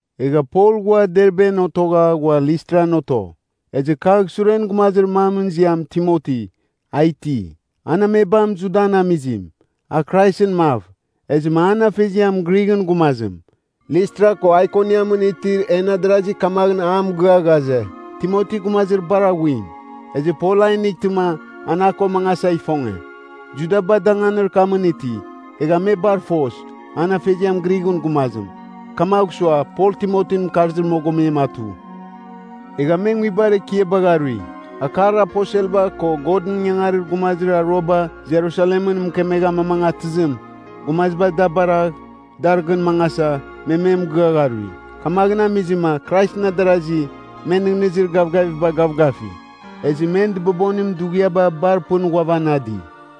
Egha Pol ghua Derben otogha ghua Listran oto. Ezɨ kagh suren gumazir mamɨn ziam Timoti, a iti. An amebam Judan amizim, a Kraisɨn mav. Ezɨma an afeziam Grighɨn gumazim. Listra ko Aikoniamɨn itir en adarasi kamaghɨn a mɨgɨa ghaze, Timoti gumazir bar aghuim. Ezɨ Pol a inightɨma, an a ko mangasa ifonge. Judaba danganir kamɨn iti. Egha me bar foz, an afeziam Grighɨn gumazim. Kamagh sua Pol Timotin mɨkarzir mogomem atu. Egha me nguibar ekiabagh arui. Akar aposelba ko Godɨn ingangarir gumazir aruaba Jerusalemɨn mɨkemegha amamangatɨzim, gumaziba da baragh, dar gɨn mangasa, me me mɨgɨa gharui. Kamaghɨn amizɨma Kraisɨn adarasi, men nɨghnɨzir gavgaviba gavgafi. Ezɨ men dɨbobonim dughiaba bar pɨn ghuavanadi.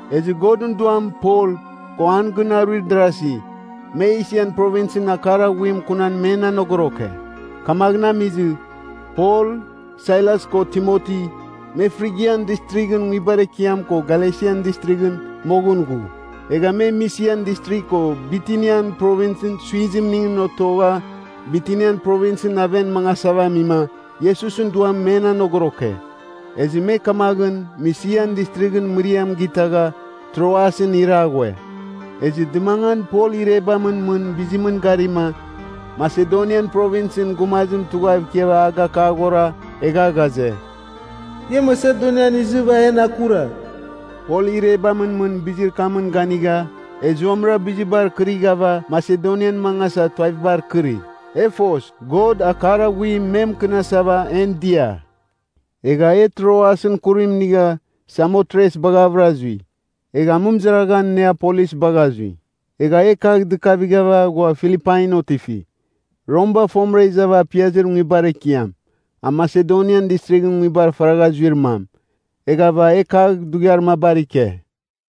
Ezɨ Godɨn Duam Pol, ko an gɨn aruir darazi, me Esian Provinsɨn akar aghuim kunan men anogoroke. Kamaghɨn amizɨ, Pol, Sailas, ko Timoti, me Frigian Distrighɨn nguibar ekiam ko Galesian Distrighɨn moghɨn ghu. Egha me Misian Distrigh ko Bitinian Provins suizimningɨn otogha Bitinian Provinsɨn aven mangasava amima, Iesusɨn Duam men anegoroke. Ezɨ me kamaghɨn Misian Distrighɨn mɨriam gatɨgha, Troasɨn ira ghue. Ezɨ dɨmangan Pol irebamɨn mɨn bizimɨn garima, Masedonian Provinsɨn gumazim tughav ikiava agakaghora, egha ghaze, “Ia Masedonian izɨva en akuragh.” Pol irebamɨn mɨn bizir kamɨn ganigha, e zuamɨra bizibar kɨrighava Masedonian mangasa tuavibar kɨri. E foz, God akar aghuim me mɨkɨnasav en dia. Egha e Troasɨn kurim inigha Samotres baghavɨra zui. Egha amɨmɨzaraghan Neapolis bagha zui. Egha e kagh dɨkavighava ghua Filipain otifi. Romba fomɨra izava apiazir nguibar ekiam. A Masedonian Distrighɨn nguibar faragha zuir mam. Eghava e kagh dughiar mabar ike.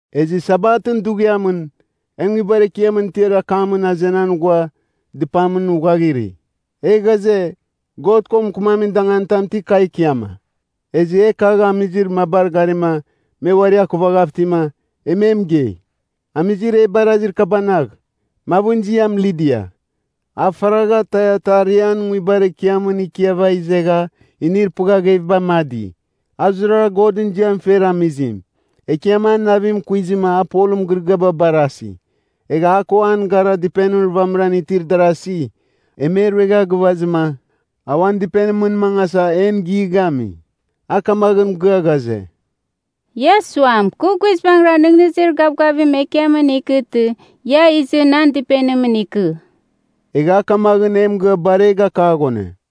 Ezɨ Sabatɨn dughiamɨn, e nguibar ekiamɨn tiar akamɨn azenan ghua dɨpamɨn uaghiri. E ghaze, God ko mɨkɨmamin danganitam ti kagh ikiama? Ezɨ e kagh amizir mabar garima me uari akuvagha itima, e me mɨgei. Amizir e barazir kabanagh, mavɨn ziam Lidia, a faragha Taiatarian nguibar ekiamɨn ikiava izegha inir pɨghagheviba amadi. A zurara Godɨn ziam fer amizim. Ekiam an navim kuizɨma a Polɨn mɨgɨrɨgɨaba barasi. Egha a ko an gara dɨpenir vamɨran itir darazi, e me ruegha gɨvazɨma, a uan dɨpenimɨn mangasa en gighami. A kamaghɨn mɨgɨa ghaze, “Ia suam, kɨ guizbangɨra nɨghnɨzir gavgavim Ekiamɨn ikɨtɨ, ia izɨ nan dɨpenimɨn ikɨ.” Egha a kamaghɨn e mɨgɨa bar e gakaghone.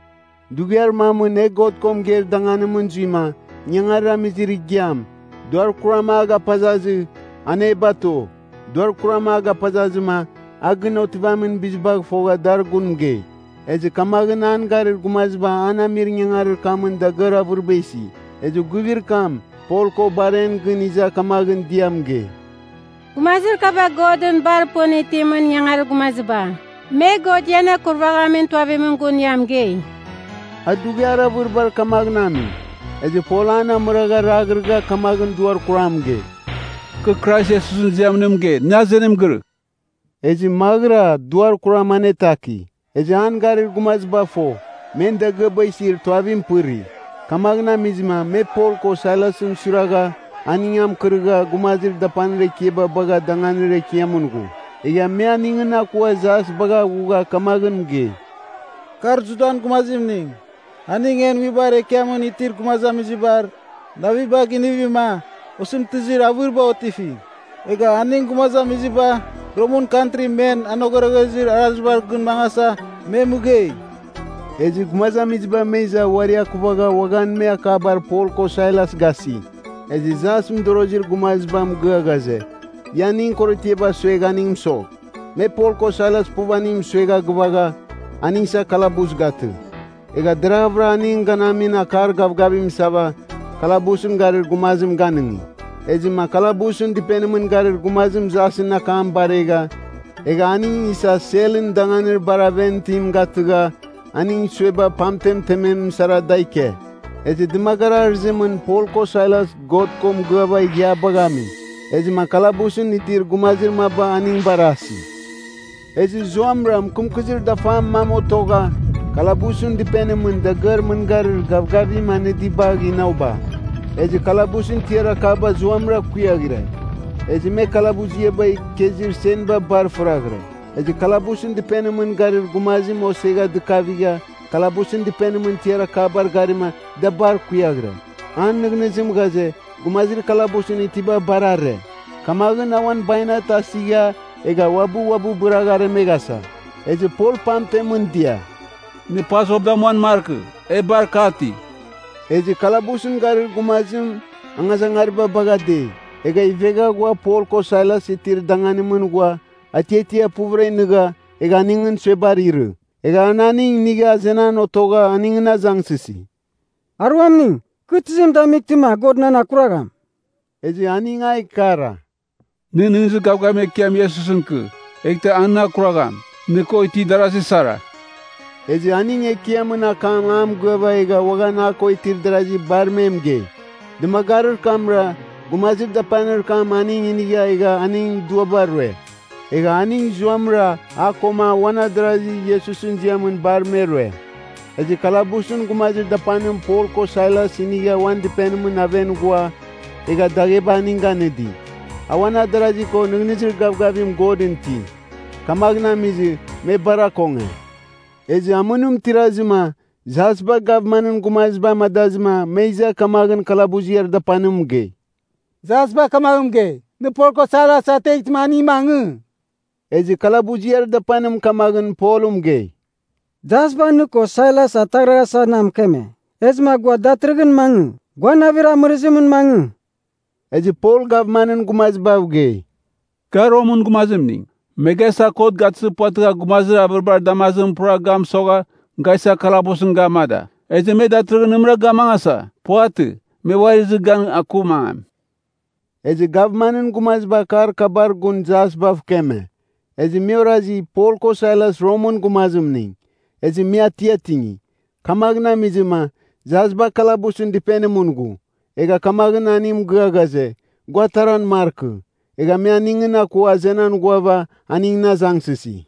Dughiar mamɨn e God ko mɨgeir danganimɨn zuima, ingangarir amizir igiam, duar kuram a gapazazɨ, an e bato. Duar kuram a gapazazɨma a gɨn otivamin bizibagh fogha dar gun mɨgei. Ezɨ kamaghɨn an garir gumaziba an amir ingangarir kamɨn dagɨar avɨriba isi. Ezɨ guivir kam, Pol ko bar en gɨn iza kamaghɨn dia mɨgei, “Gumazir kaba Godɨn bar pɨn itimɨn ingangarir gumaziba. Me God ian akurvaghamin tuavimɨn gun ia mɨgei.” A dughiar avɨribar kamaghɨn ami. Ezɨ Pol an amɨrɨgha raghrɨgha kamaghɨn duar kuram mɨgei, “Kɨ Krais Iesusɨn ziamɨn nɨ mɨgei, nɨ azenim girɨgh!” Ezɨ maghɨra duar kuram anetaki. Ezɨ an garir gumaziba fo, men dagɨaba isir tuavim pɨri. Kamaghɨn amizɨma me Pol ko Sailasɨn suiragha aning amɨkɨrɨgha gumazir dapanir ekiaba bagha danganir ekiamɨn ghu. Egha me aningɨn akua jas bagha ghugha kamaghɨn mɨgei, “Kar Judan gumazimning. Aning en nguibar ekiamɨn itir gumazamizibar navibagh inivima osɨmtɨzir avɨriba otifi. Egha aning gumazamiziba, Romɨn kantri men anogoroghezir arazibar gɨn mangasa, me mɨgei.” Ezɨ gumazamiziba me iza uari akuvagha uaghan me akabar Pol ko Sailas gasi. Ezɨ jas mɨdorozir gumaziba mɨgɨa ghaze, ia aningɨn korotiaba suegh aning mɨsogh. Me Pol ko Sailas puv aning mɨsuegha gɨvagha, aning isa kalabus gatɨ. Egha deraghɨva aning ganamin akar gavgavim isava, kalabusɨn garir gumazim ganɨngi. Ezɨma kalabusɨn dɨpenimɨn garir gumazim jasɨn akam baregha, egha aning isa selɨn danganir bar aven itim gatɨgha, aning sueba pamtem temem sara da ike. Ezɨ dɨmagarir arɨzimɨn Pol ko Sailas God ko mɨgɨava ighiabagh ami. Ezɨma kalabusɨn itir gumazir maba aning barasi. Ezɨ zuamɨra mɨkɨmkɨzir dafar mam otogha, kalabusɨn dɨpenimɨn dagɨar mɨngarir gavgavim anɨdibagh inoba. Ezɨ kalabusɨn tiar akaba zuamɨra kuiaghire. Ezɨ me kalabuziaba ikezir senba bar fɨriaghire. Ezɨ kalabusɨn dɨpenimɨn garir gumazim osegha dɨkavigha kalabusɨn dɨpenimɨn tiar akabar garima da bar kuiaghire, an nɨghnɨzim ghaze gumazir kalabusɨn itiba bar are. Kamaghɨn a uan bainat asigha egha uabɨ uabɨ bɨragh aremeghasa. Ezɨ Pol pamtemɨn dia, “Nɨ pazɨ uabɨ damuan markɨ! E bar ka iti.” Ezɨ kalabusɨn garir gumazim angazangariba bagha dei, egha ivegha ghua Pol ko Sailas itir danganimɨn ghua atiatia puvɨra nɨgha, egha aningɨn suebar irɨ. Egha an aning inigha azenan otogha aningɨn azangsɨsi, “Aruamning, kɨ tizim damightɨma God nan akuragham?” Ezɨ aning a ikara, “Nɨ nɨghnɨzir gavgavim Ekiam Iesusɨn ikɨ, eghtɨ a nɨn akuragham, nɨ ko itir darasi sara.” Ezɨ aning Ekiamɨn akam a mɨgɨava egha uaghan a ko itir darazi bar me mɨgei. Dɨmagarir kamra, gumazir dapanir kam aning inigha egha aning duaba rue. Egha aning zuamɨra a koma uan adarazi Iesusɨn ziamɨn bar me rue. Ezɨ kalabusɨn gumazir dapanim Pol ko Sailas inigha uan dɨpenimɨn aven ghua, egha dagheba aning ganɨdi. A uan adarazi ko nɨghnɨzir gavgavim Godɨn iti. Kamaghɨn amizɨ, me bar akonge. Ezɨ amɨnim tirazɨma, jasba gavmanɨn gumaziba amadazɨma me iza kamaghɨn kalabuziar dapanim mɨgei, “Jasba kamaghɨn mɨgei, ‘Nɨ Pol ko Sailas ateghtɨma aning mangɨ.’” Ezɨ kalabuziar dapanim kamaghɨn Pol mɨgei, “Jasba nɨ ko Sailas ataghraghasa na mɨkeme. Ezɨma gua datɨrɨghɨn mangɨ. Gua navir amɨrɨzimɨn mangɨ.” Ezɨ Pol gavmanɨn gumazibav gei, “Ga Romɨn gumazimning. Me ga isa kot gatɨzir puvatɨgha gumazir avɨribar damazimɨn pura ga mɨsogha, ga isa kalabusɨn ga amada. Ezɨ me datɨrɨghɨn nɨmɨra ga amangasa? Puvatɨ! Me uari izɨva gan aku mangam.” Ezɨ gavmanɨn gumaziba akar kabar gun jasbav keme. Ezɨ me orazi Pol ko Sailas Romɨn gumazimning. Ezɨ me atiatingi. Kamaghɨn amizɨma, jasba kalabusɨn dɨpenimɨn ghu. Egha kamaghɨn aning mɨgɨa ghaze, gua ataran markɨ. Egha me aningɨn akua azenan ghuava, aningɨn azangsɨsi,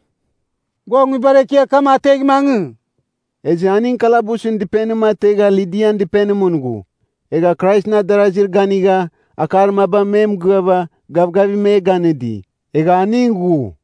“Gua nguibar ekiar kam ategh mangɨ.” Ezɨ aning kalabusɨn dɨpenim ategha Lidian dɨpenimɨn ghu. Egha Kraisɨn adarazir ganigha, akar maba me mɨgɨava, gavgavim me ganɨdi. Egha aning ghu.